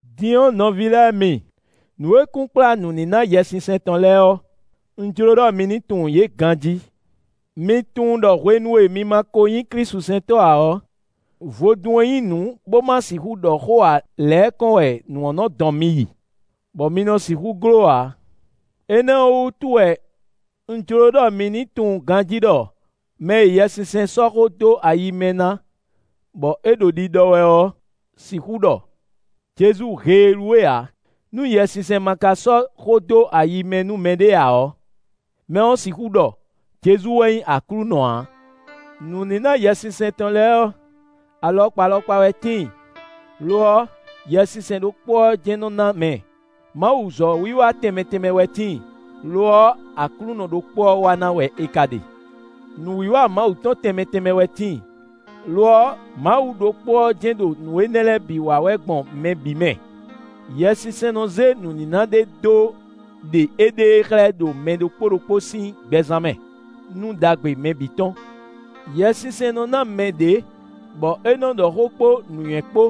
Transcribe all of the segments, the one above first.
Din ɔ́ nɔví lɛ́ɛ mi, nǔ e kunkplá nǔníná Yɛsinsɛn tɔn lɛ́ɛ ɔ́, un jló ɖɔ mi ní tunwun yě ganjí. Mi tunwun ɖɔ hwenu e mi ma ko nyí klísusɛntɔ́ ǎ ɔ́, vodún e nyí nǔ bo ma sixú ɖɔ xó ǎ lɛ́ɛ kɔn wɛ nǔ ɔ́ nɔ dɔn mi yi, bɔ mi nɔ sixú gló ǎ. Énɛ́ ɔ́ wú wɛ un jló ɖɔ mi ní tunwun ganjí ɖɔ mɛ e Yɛsinsɛn sɔ́ xó dó ayi mɛ na bɔ é ɖo ɖiɖɔ wɛ ɔ́ sixú ɖɔ: “Jezu heelú we” ǎ; nú Yɛsinsɛn ma ka sɔ́ xó dó ayi mɛ nú mɛɖé ǎ ɔ́, mɛ ɔ́ sixú ɖɔ: “Jezu wɛ nyí Aklúnɔ” ǎ. Nǔníná Yɛsinsɛn tɔn lɛ́ɛ ɔ́, alɔkpa alɔkpa wɛ tíin; lo ɔ́, Yɛsinsɛn ɖokpó ɔ́ jɛ́n nɔ na mɛ. Mawuzɔ̌ wiwa tɛnmɛ tɛnmɛ wɛ tíin; lo ɔ́, Aklúnɔ ɖokpó ɔ́ wa ná wɛ è ka ɖe. Nǔwiwa Mawu tɔn tɛnmɛ tɛnmɛ wɛ tíin, lo ɔ́, Mawu ɖokpó ɔ́ jɛ́n ɖo nǔ énɛ́ lɛ́ɛ bǐ wa wɛ gbɔn mɛ bǐ mɛ. Yɛsinsɛn nɔ zé nǔníná ɖé dó ɖe éɖée xlɛ́ ɖo mɛ ɖokpó ɖokpó sín gbɛzán mɛ, nú ɖagbe mɛ bǐ tɔn. Yɛsinsɛn nɔ ná mɛ ɖě, bɔ é nɔ ɖɔ xó kpó nǔnywɛ́ kpó;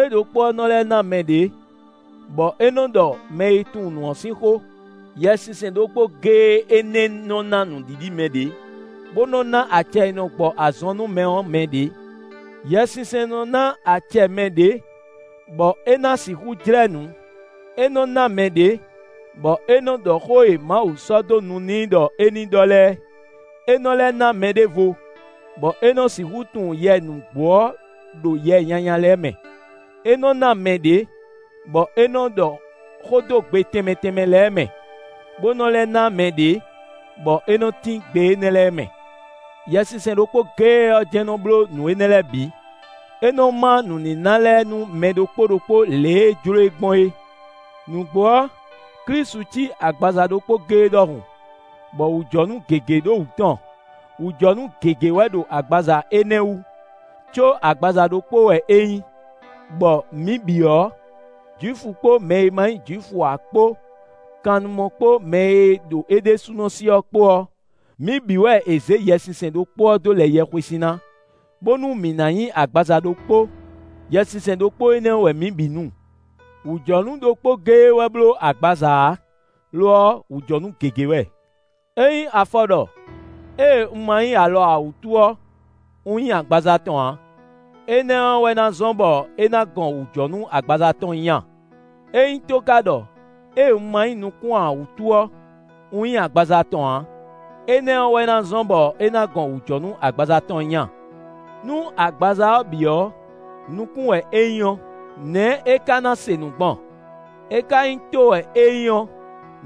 é ɖokpó ɔ́ nɔ lɛ́ ná mɛ ɖě, bɔ é nɔ ɖɔ mɛ e tunwun nǔ ɔ́ sín xó. Yɛsinsɛn ɖokpó géé énɛ́ nɔ ná nǔɖiɖi mɛ ɖě, bó nɔ ná acɛ e nɔ gbɔ azɔn nú mɛ ɔ́ mɛ ɖě. Yɛsinsɛn nɔ ná acɛ mɛ ɖě, bɔ é ná sixú jlɛ́ nǔ; é nɔ ná mɛ ɖě, bɔ é nɔ ɖɔ xó e Mawu sɔ́ dó nu n'i ɖɔ é ní ɖɔ lɛ́ɛ; é nɔ lɛ́ ná mɛɖěvo, bɔ é nɔ sixú tunwun yɛ nǔgbó ɔ́ ɖo yɛ nyanya lɛ́ɛ mɛ. É nɔ ná mɛ ɖě, bɔ é nɔ ɖɔ xó dó gbe tɛnmɛ tɛnmɛ lɛ́ɛ mɛ, bó nɔ́ lɛ́ ná mɛ ɖě, bɔ é nɔ tín gbe énɛ́ lɛ́ɛ mɛ. Yɛsinsɛn ɖokpó géé ɔ́ jɛ́n nɔ bló nǔ énɛ́ lɛ́ɛ bǐ; é nɔ ma nǔníná lɛ́ɛ nú mɛ ɖokpó ɖokpó lě e é jló e gbɔn é. Nǔgbó ɔ́, Klísu cí agbaza ɖokpó géé ɖɔhun, bɔ wǔjɔnú gěgé ɖo wǔ tɔn; wǔjɔnú gěgé wɛ ɖo agbaza énɛ́ wú, có agbaza ɖokpó wɛ é nyí, bɔ mǐ bǐ ɔ́, Jwifu kpó mɛ e ma nyí Jwifu ǎ kpó, kannumɔ kpó mɛ e ɖo é ɖésúnɔ sí ɔ́ kpó ɔ́, mǐ bǐ wɛ è zě Yɛsinsɛn ɖokpó ɔ́ dó lɛ yɛhwesin ná, bónú mǐ ná nyí agbaza ɖokpó; Yɛsinsɛn ɖokpó énɛ́ wɛ mǐ bǐ nu. Wǔjɔnú ɖokpó géé wɛ bló agbaza ǎ; lo ɔ́, wǔjɔnú gěgé wɛ. Ényí afɔ ɖɔ: “Ée un ma nyí alɔ ǎ wútu ɔ́, un nyí agbaza tɔn ǎ”; énɛ́ ɔ́ wɛ ná zɔ́n bɔ é ná gɔn wǔjɔnú agbaza tɔn nyí a? Ényí tó ka ɖɔ: “Ée un ma nyí nukún ǎ wútu ɔ́, un nyí agbaza tɔn ǎ”; énɛ́ ɔ́ wɛ na zɔ́n bɔ é ná gɔn wǔjɔnú agbaza tɔn nyí a? Nú agbaza ɔ́ bǐ ɔ́ nukún wɛ é nyí ɔ́, nɛ̌ é ka na se nǔ gbɔn? É ka nyí tó wɛ é nyí ɔ́,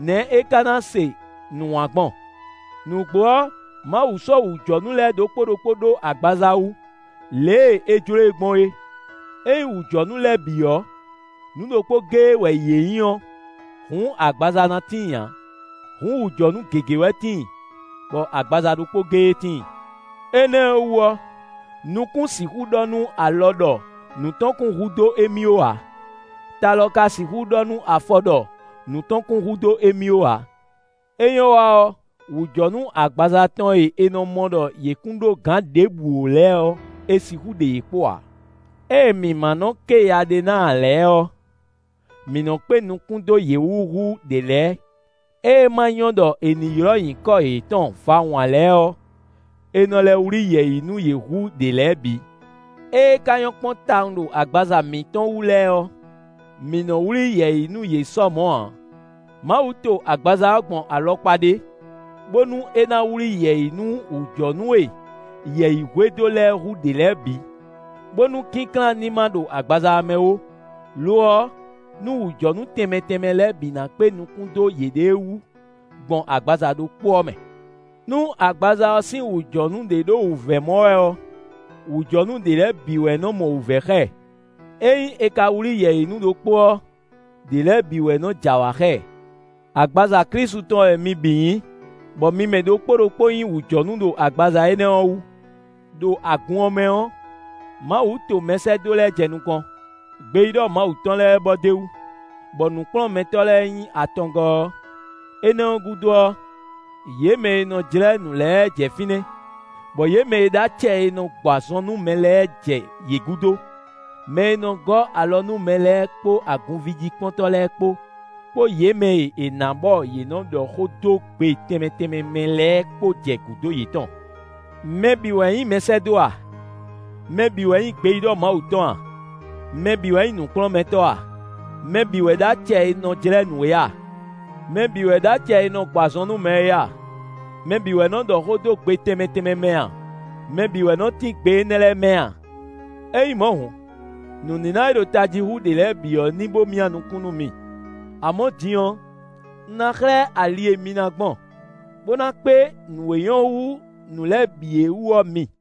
nɛ̌ é ná se nǔ wǎn gbɔn? Nǔgbó ɔ́, Mawu sɔ́ wǔjɔnú lɛ́ɛ ɖokpó ɖokpó ɖó agbaza wú, lě e é jló e gbɔn é. Ényí wǔjɔnú lɛ́ɛ bǐ ɔ́, nǔ ɖokpó géé wɛ yě nyí ɔ́, hǔn agbaza na tíin ǎ! Hǔn wǔjɔnú gěgé wɛ tíin, bɔ agbaza ɖokpó géé tíin. Énɛ́ ɔ́ wú ɔ́, nukún sixú ɖɔ nú alɔ ɖɔ nǔ tɔn kún hu dó émí ó ǎ. Ta lɔ ka sixú ɖɔ nú afɔ ɖɔ nǔ tɔn kún hu dó émí ó ǎ. É nyɔ́ wa ɔ́, wǔjɔnú agbaza tɔn e è nɔ mɔ ɖɔ yě kún ɖó gǎn ɖěbǔ ó lɛ́ɛ ɔ́, è sixú ɖe yě kpo ǎ. Ée mǐ ma nɔ́ ké ya ɖé ná ǎ lɛ́ɛ ɔ́, mǐ nɔ́ kpé nukún dó yě wú hú ɖě lɛ́ɛ. Ée ma nyɔ́ ɖɔ è nǐ ylɔ́ nyǐkɔ yětɔn vawun ǎ lɛ́ɛ ɔ́, è nɔ lɛ́ wlí yɛ̌yi nú yě hú ɖě lɛ́ɛ bǐ. Ée ka nyɔ́ kpɔ́n tawun ɖo agbaza mǐtɔn wú lɛ́ɛ ɔ́, mǐ nɔ wlí yɛ̌yi nú yě sɔ mɔ̌ ǎ. Mawu to agbaza ɔ́ gbɔn alɔkpa ɖé bónú é ná wlí yɛ̌yi nú wǔjɔnú e yɛ̌yi hwedó lɛ́ɛ hú ɖě lɛ́ɛ bǐ, bónú kínklán ní ma ɖo agbaza ɔ́ mɛ ó; lo ɔ́, nú wǔjɔnú tɛnmɛ tɛnmɛ lɛ́ɛ bǐ na kpé nukún dó yěɖée wú, gbɔn agbaza ɖokpó ɔ́ mɛ. Nú agbaza ɔ́ sín wǔjɔnú ɖé ɖo wǔvɛ́ mɔ wɛ ɔ́, wǔjɔnú ɖě lɛ́ɛ bǐ wɛ nɔ mɔ wǔvɛ́ xá ɛ; ényí è ka wlí yɛ̌yi nú ɖokpó ɔ́, ɖě lɛ́ɛ bǐ wɛ nɔ j'awǎ xá ɛ. Agbaza Klísu tɔn wɛ mi bǐ nyí, bɔ mi mɛ ɖokpó ɖokpó nyí wǔjɔnú ɖo agbaza énɛ́ ɔ́ wú. Đo agun ɔ́ mɛ ɔ́, Mawu to mɛsɛ́dó lɛ́ɛ jɛ nukɔn; gbeyíɖɔ Mawu tɔn lɛ́ɛ bɔ d'é wú, bɔ nǔkplɔ́nmɛtɔ́ lɛ́ɛ nyí atɔngɔ́ ɔ́; énɛ́ ɔ́ gúdo ɔ́, yě mɛ e nɔ jlɛ́ nǔ lɛ́ɛ jɛ fínɛ́, bɔ yě mɛ e ɖó acɛ e nɔ gbɔ azɔn nú mɛ lɛ́ɛ jɛ yě gúdo; mɛ e nɔ gɔ́ alɔ nú mɛ lɛ́ɛ kpó agunvíjíkpɔ́ntɔ́ lɛ́ɛ kpó, kpó yě mɛ e è nǎ bɔ yě nɔ ɖɔ xó dó gbe tɛnmɛ tɛnmɛ mɛ lɛ́ɛ kpó jɛ gǔdo yětɔn. Mɛ bǐ wɛ nyí mɛsɛ́dó a? Mɛ bǐ wɛ nyí gbeyíɖɔ Mawu tɔn a? Mɛ bǐ wɛ nyí nǔkplɔ́nmɛtɔ́ a? Mɛ bǐ wɛ ɖó acɛ e nɔ jlɛ́ nǔ é a? Mɛ bǐ wɛ ɖó acɛ e nɔ gbɔ azɔn nú mɛ é a? Mɛ bǐ wɛ nɔ ɖɔ xó dó gbe tɛnmɛ tɛnmɛ mɛ a? Mɛ bǐ wɛ nɔ tín gbe énɛ́ lɛ́ɛ mɛ a? Ényí mɔ̌ hǔn, nǔníná e ɖo tají hú ɖě lɛ́ɛ bǐ ɔ́ ní bó myá nukún nú mi. Amɔ̌ din ɔ́, un ná xlɛ́ ali e mi ná gbɔn, bó ná kpé nǔ e nyɔ́ hú nǔ lɛ́ɛ bǐ é wú ɔ́ mi.